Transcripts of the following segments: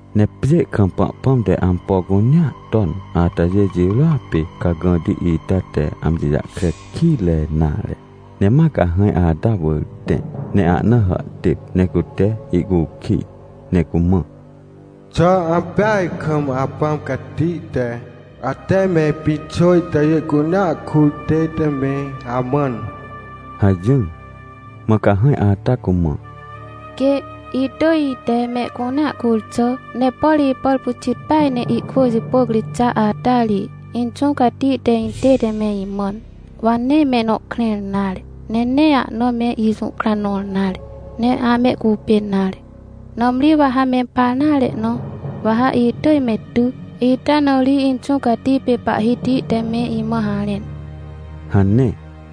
Ne pjê kam Pahpãm te ampo cunea ton atajê jirôa pê cagãti ita te amji jahkre kitre nare. Ne ma cahãj ata wỳr tẽ ne ahna hàhtêp, ne cute ihcukij, ne cumã: — Xà ampeaj kam Apãm Cati te, ate me pĩxô itajê cunea kur tête me amãn? — hajỹr. Mã cahãj ata cumã: — Quê, itỳj ite mehcunea kur xà. Ne por ipàr pyxit peaj ne ihkwỳ jipôc ri xa ata ri, Inxũ Cati te intête me imãn, wa nee mehnõ krẽr nare, ne nee ahna me ijũhkra nõr nare, ne amehcupên nare. Nãmri wa ha mempar nare na, wa ha itỳj me ty, ita na ri Inxũ Cati pê Pahhiti te me imã harẽn — hane.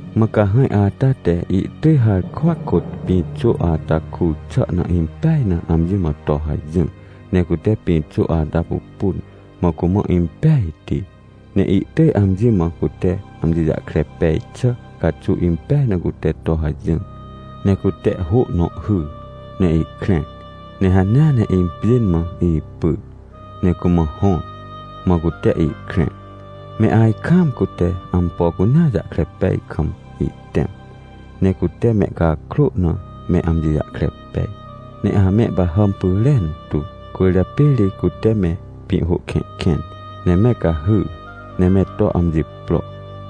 Mã cahãj ata te ihtỳj harkwa kôt pĩxô ata kur xà na impeaj na amji mã to hajỹr. Ne cute pĩxô ata pupun, mã cumã impejti, ne ihtỳj amji mã cute amji jahkre pej xà caxuw impej na cute to hajỹr. Ne cute hô nõ hyr ne ihkrẽr, ne hanea ne impjên mã ipyr ne cumã hõr, mã cute ihkrẽr. Me ajkaam cute ampo cunea jahkre pej kam ihtẽm, ne cute mehcakrô na me amji jahkre pej, ne amehpahàm pyrentu. Cwỳrjapê ri cute me pĩhhô kẽhkẽn, ne me cahyr, ne me to amji pro.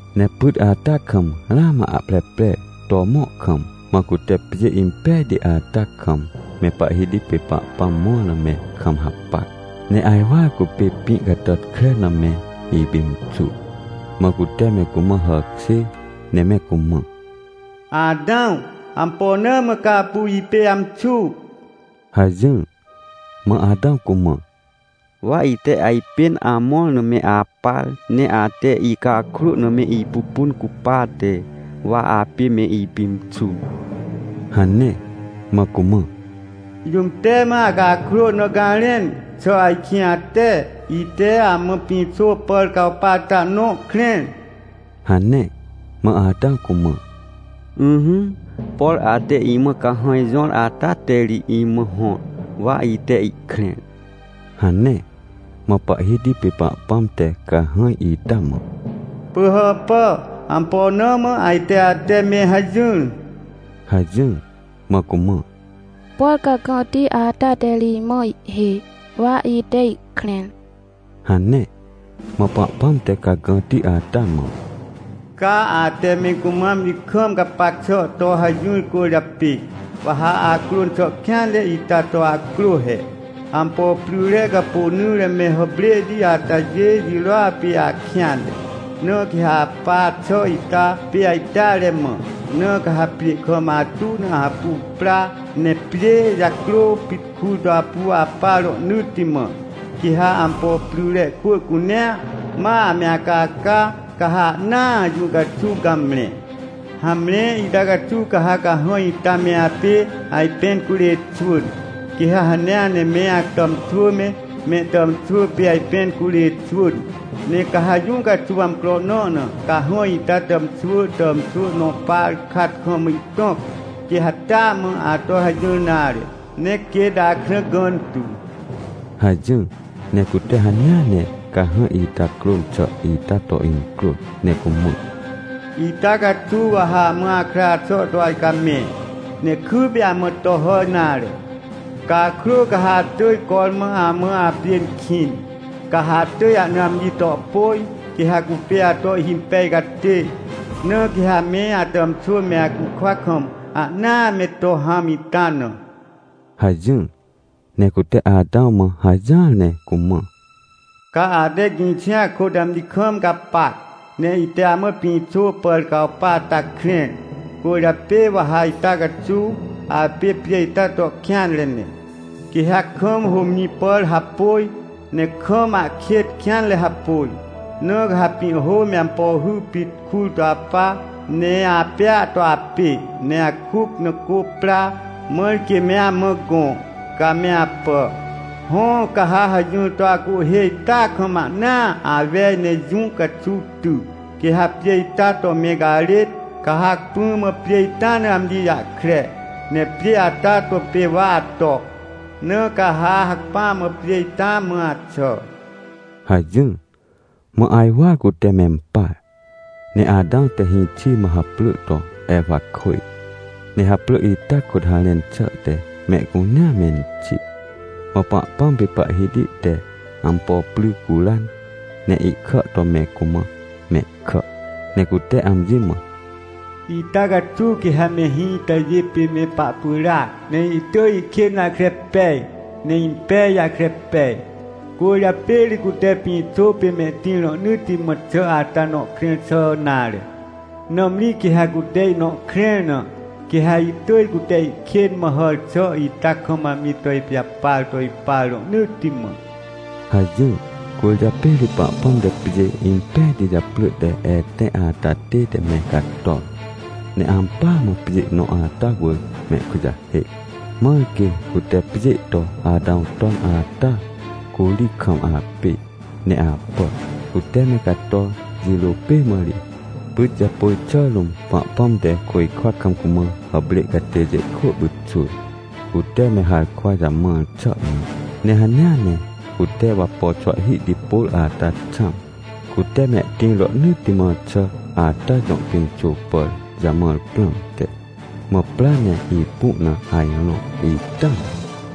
Ne pyt ata kam ramã ahpreprer to mõr kam, mã cute pjê impejti ata kam, me Pahhiti pê Pahpãm mõr na me kam hapac, ne ajwar cupê pĩ catàtkre na me ipimxur. Mã cute me cumã hàkjêr ne me cumã: — Atãw, ampo na mã ca apu ipê amxu? — hajỹr. Mã Atãw cumã: — Wa ite ajpên amõr na me apar, ne ate icakrô na me ipupun cupate, wa apê me ipimxur — hane. Mã cumã: — Jũm te mã acakrô na garẽn? Xà ajkĩ ate, ite amã pĩxô pàr cawpa ata nõ krẽr? — hane. Mã Atãw cumã: — Ỹhỹ, por ate imã cahãj jõr ata te ri imã hõr, wa ite ihkrẽr — hane. Mã Pahhiti pê Pahpãm te cahãj ita mã: — Pỳhàpà, ampo na mã ajte ate me hajỹr? — hajỹr. Mã cumã: — Por cagãti ata te ri imã ihhêj, wa ite ihkrẽr — hane. Mã Pahpãm te cagãti ata mã: — Ca ate me cumã amji kam gapac xà to hajỹr cwỳrjapê, wa ha acrôn xà kêanre ita to acrô he. Ampo pryre capônỹre me hàprêhti atajê jirôa pê akêanre. Na quê ha apa xà ita pê ajteare mã, na ca ha pjê kam atu na apu pra, ne pjê jacrô pit kur to apu apa rohnỳtti mã. Quê ha ampo pryre kwỳ cunea, ma ame acaca, ca ha ahnaa jũ caxuw gamre. Hamre, ita caxuw ca ha cahãj ita me apê ajpẽn curê xwỳn. Quê ha hanea ne me atàmxwỳ me, mehtàmxwỳ pê ajpẽn curê xwỳn. Ne ca ha jũ caxuw amcro nõ na, cahãj ita tàmxwỳ tàmxwỳ nõ par kat kam ihtõc, quê ha taa mã ato hajỹr nare, ne quêt akrã gãntu — hajỹr. Ne cute hanea ne cahãj ita crôn xà ita to incrôn, ne cumã: — Ita caxuw wa ha amã akra xà to ajcamẽ, ne kypê amã to hà nare. Cakrô ca ha atỳj cormã amã apjên kĩn, ca ha atỳj ahna amji to pôj, quê ha cupê ato ihhimpej catê. Na quê ha me atàmxwỳ me acukwa kam, ahnaa me to hãm ita na — hajỹr. Ne cute Atãw mã hajỹar ne cumã: — Ca ate gĩxia kôt amji kam gapac, ne ite amã pĩxô pàr cawpa ata krẽr, cwỳrjapê wa ha ita caxuw apê pjê ita to kêanre ne. Quê ha kam hômjĩ pàr hapôj, ne kam ahkêt kêanre hapôj, na ca ha pĩhhô me ampo hy pit kur to apa, ne apêa to apê, ne akuc na cô pra, mãr quê me amã gõ, ca me apà. Hõ, ca ha hajỹr to acuhhê ita kam ahnaa awej ne jũ caxuw ty, quê ha pjê ita to me garêt, ca ha hacpỹ mã pjê ita na amji jahkre. Ne pjê ata to pê wa ato, na ca ha hacpỹa mã pjê ita mã axà — hajỹr. Mã ajwar cute mempar. Ne Atãw te hĩxi mã haprỳ to Ewakwỳj, ne haprỳ ita kôt harẽn xà te “Mehcunea menxi”. Mã Pahpãm pê Pahhiti te ampo pry curan, ne ihkà to me cumã mehkà. Ne cute amji mã: — Ita caxuw quê ha mehĩ itajê pê me pahpyràac, ne ihtỳj ihkên jahkre pej ne impej jahkre pej. Cwỳrjapê ri cute pĩxô pê mehtĩr rohnỳtti mã xà ata nõ krẽr xà nare. Nãmri quê ha cute ihnõ krẽr na, quê ha ihtỳj cute ihkên mã hàr xà ita kam amji to ipijapar to ipa rohnỳtti mã — hajỹr. Cwỳrjapê ri Pahpãm te pjê impejti japrỳ te Etẽ ata tête me cator, ne ampỳa mã pjê nõ ata wỳr mehkujahêc, mãr quê, cute pjê to Atãw ton ata, curi kam apê ne apà. Cute me cator jirô pê mã ri, pyt japôj xà rũm, Pahpãm te côjkwa kam cumã hàprê catêjê kwỳ pyxwỳr, cute me harkwa jamãr xà na. Ne hanea ne cute wapo xwahhihti pôr ata xãm, cute mehtĩr rohnỳtti mã xà ata jõ pĩxô pàr jamãr prãmte. Mã pra ne ipu na ajrõ ita na.